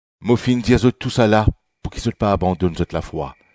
“Mo finn dir zot tousala pouki zot pa abandonn zot lafwa.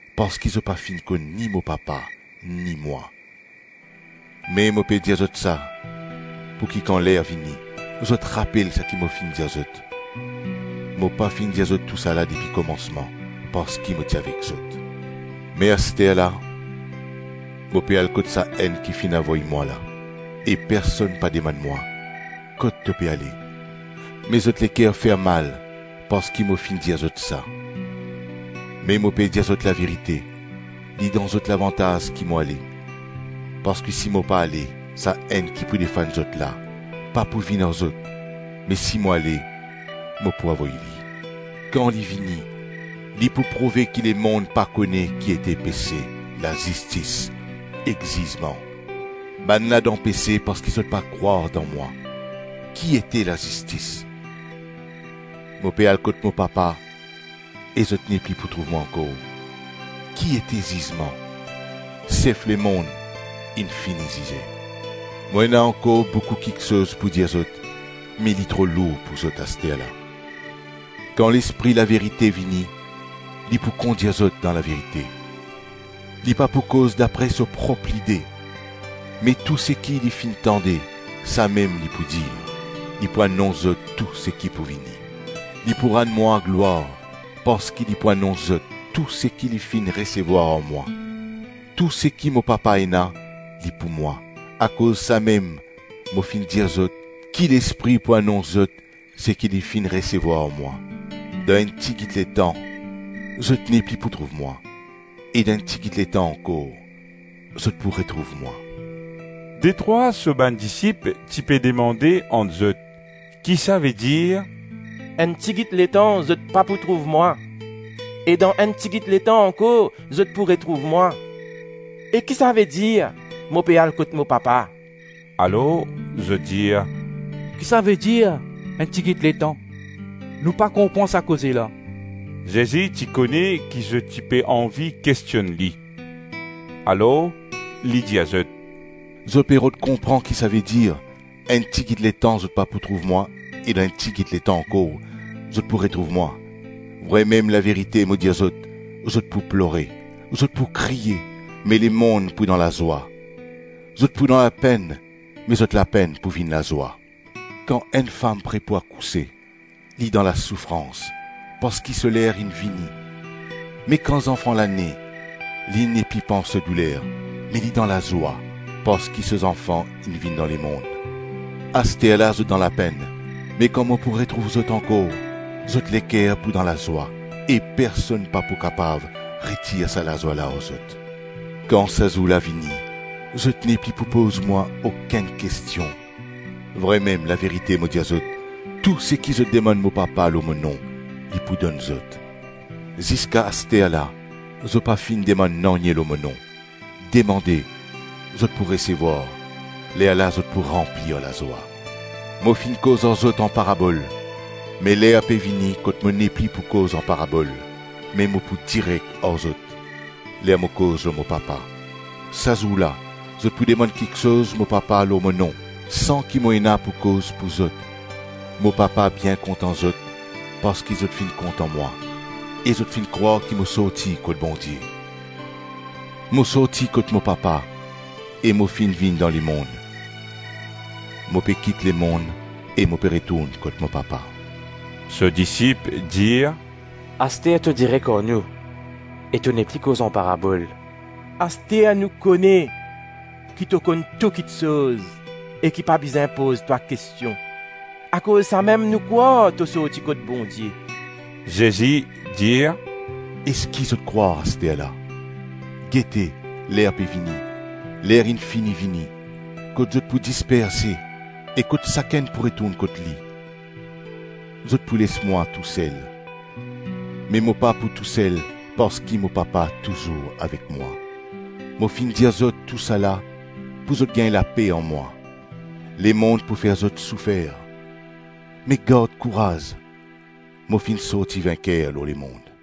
parski zot pa finn konn ni mo Papa, ni mwa. Me mo pe dir zot sa, pouki kan ler vini, zot rapel seki mo finn dir zot. Travay Lespri Mo pa finn dir zot tousala depi komansman parski mo ti avek zot. Me asterla mo pe al kot Sa-Enn ki finn avoy mwa la e personn pa demann mwa, ‘Kot to pe ale?’ Me zot leker fer mal parski mo finn dir zot sa. Me mo pe dir zot laverite, li dan zot lavantaz ki mo ale; parski si mo pa ale, Sa-Enn ki pou defann zot la, pa pou vinn ar zot; me si mo ale, mo pou avoy li. Kan li vini, li pou prouve ki lemonn pa kone ki ete pese, lazistis ek zizman. Bannla dan pese parski zot pa krwar dan mwa; Ki ete lazistis? Mo pe al kot mo Papa e zot nepli pou trouv mwa ankor; Ki ete zizman? Sef lemonn inn fini zize. Mo ena ankor boukou kiksoz pou dir zot me li tro lour pou zot, asterla; Kan Lespri laverite vini, li pou kondir zot dan laverite. Li pa pou koz dapre so prop lide, me tou seki li finn tande, samem li pou dir; li pou anons zot tou seki pou vini. Li pou rann mwa glwar parski li pou anons zot tou seki li finn resevwar ar mwa. Tou seki mo Papa ena, li pou mwa; akoz samem mo finn dir zot, ki Lespri pou anons zot seki li finn resevwar ar mwa. Dan enn tigit letan zot nepli pou trouv mwa e dan enn tigit letan ankor, zot pou retrouv mwa.” Detrwa so bann disip ti pe demande ant zot, ki savedir “Enn tigit letan zot pa pou trouv mwa e dan enn tigit letan ankor, zot pou retrouv mwa?” E ki savedir “Mo pe al kot mo Papa?” Alors zot dir, “Ki savedir ‘enn tigit letan?’ Nou pa konpran sa koze la.” Zezi ti kone ki zot ti pe anvi kestionn li; alors li dir zot, “Zot pe rod konpran ki savedir, ‘Enn tigit letan zot pa pou trouv mwa e dan enn tigit letan ankor zot pou retrouv mwa?’ Vremem, laverite mo dir zot: zot pou plore, zot pou kriye me lemonn pou dan lazwa. Zot pou dan lapenn me zot lapenn pou vinn lazwa. Kan enn fam pre pou akouse, li dan lasoufrans parski so ler inn vini; me kan zanfan la ne, li nepli pans so douler me li dan lazwa parski so zanfan inn vinn dan lemonn. Asterla zot dan lapenn me kan mo pou retrouv zot ankor, zot leker pou dan lazwa e personn pa pou kapav retir sa lazwa la ar zot. Kan sa zour la vini, zot nepli pou poz mwa okenn kestion; vremem, laverite mo dir zot, tou seki zot demann mo Papa lor mo nom, li pou donn zot. Ziska asterla, zot pa finn demann nanye lor mo nom; demande, zot pou resevwar, lerla zot pou ranpli ar lazwa. Mo finn koz ar zot an parabol; me ler pe vini kot mo nepli pou koz an parabol me mo pou direk ar zot, ler mo koz lor mo Papa Sa zour la, zot pou demann kiksoz mo Papa lor mo nom, san ki mo ena pou koz pou zot. Mo Papa bien kontan zot parski zot finn kontan mwa e zot finn krwar ki mo sorti kot Bondie. Mo sorti kot mo Papa e mo finn vinn dan lemonn; mo pe kit lemonn e mo pe retourn kot mo Papa.” So disip dir, “Aster to direk ar nou e to nepli koz an parabol. Aster nou kone ki to konn tou kiksoz e ki pa bizin poz twa kestion; akoz samem nou krwar to sorti kot Bondie.” Zezi dir, “Eski zot krwar asterla? Gete, ler pe vini, ler inn fini vini, kot zot pou disperse e kot sakenn pou retourn kot li. Zot pou les mwa tousel, me mo pa tousel parski mo Papa touzour avek mwa. Mo finn dir zot tousala pou zot gagn lape an mwa. Lemonn pou fer zot soufer; me gard kouraz, mo finn sorti vinker lor lemonn.”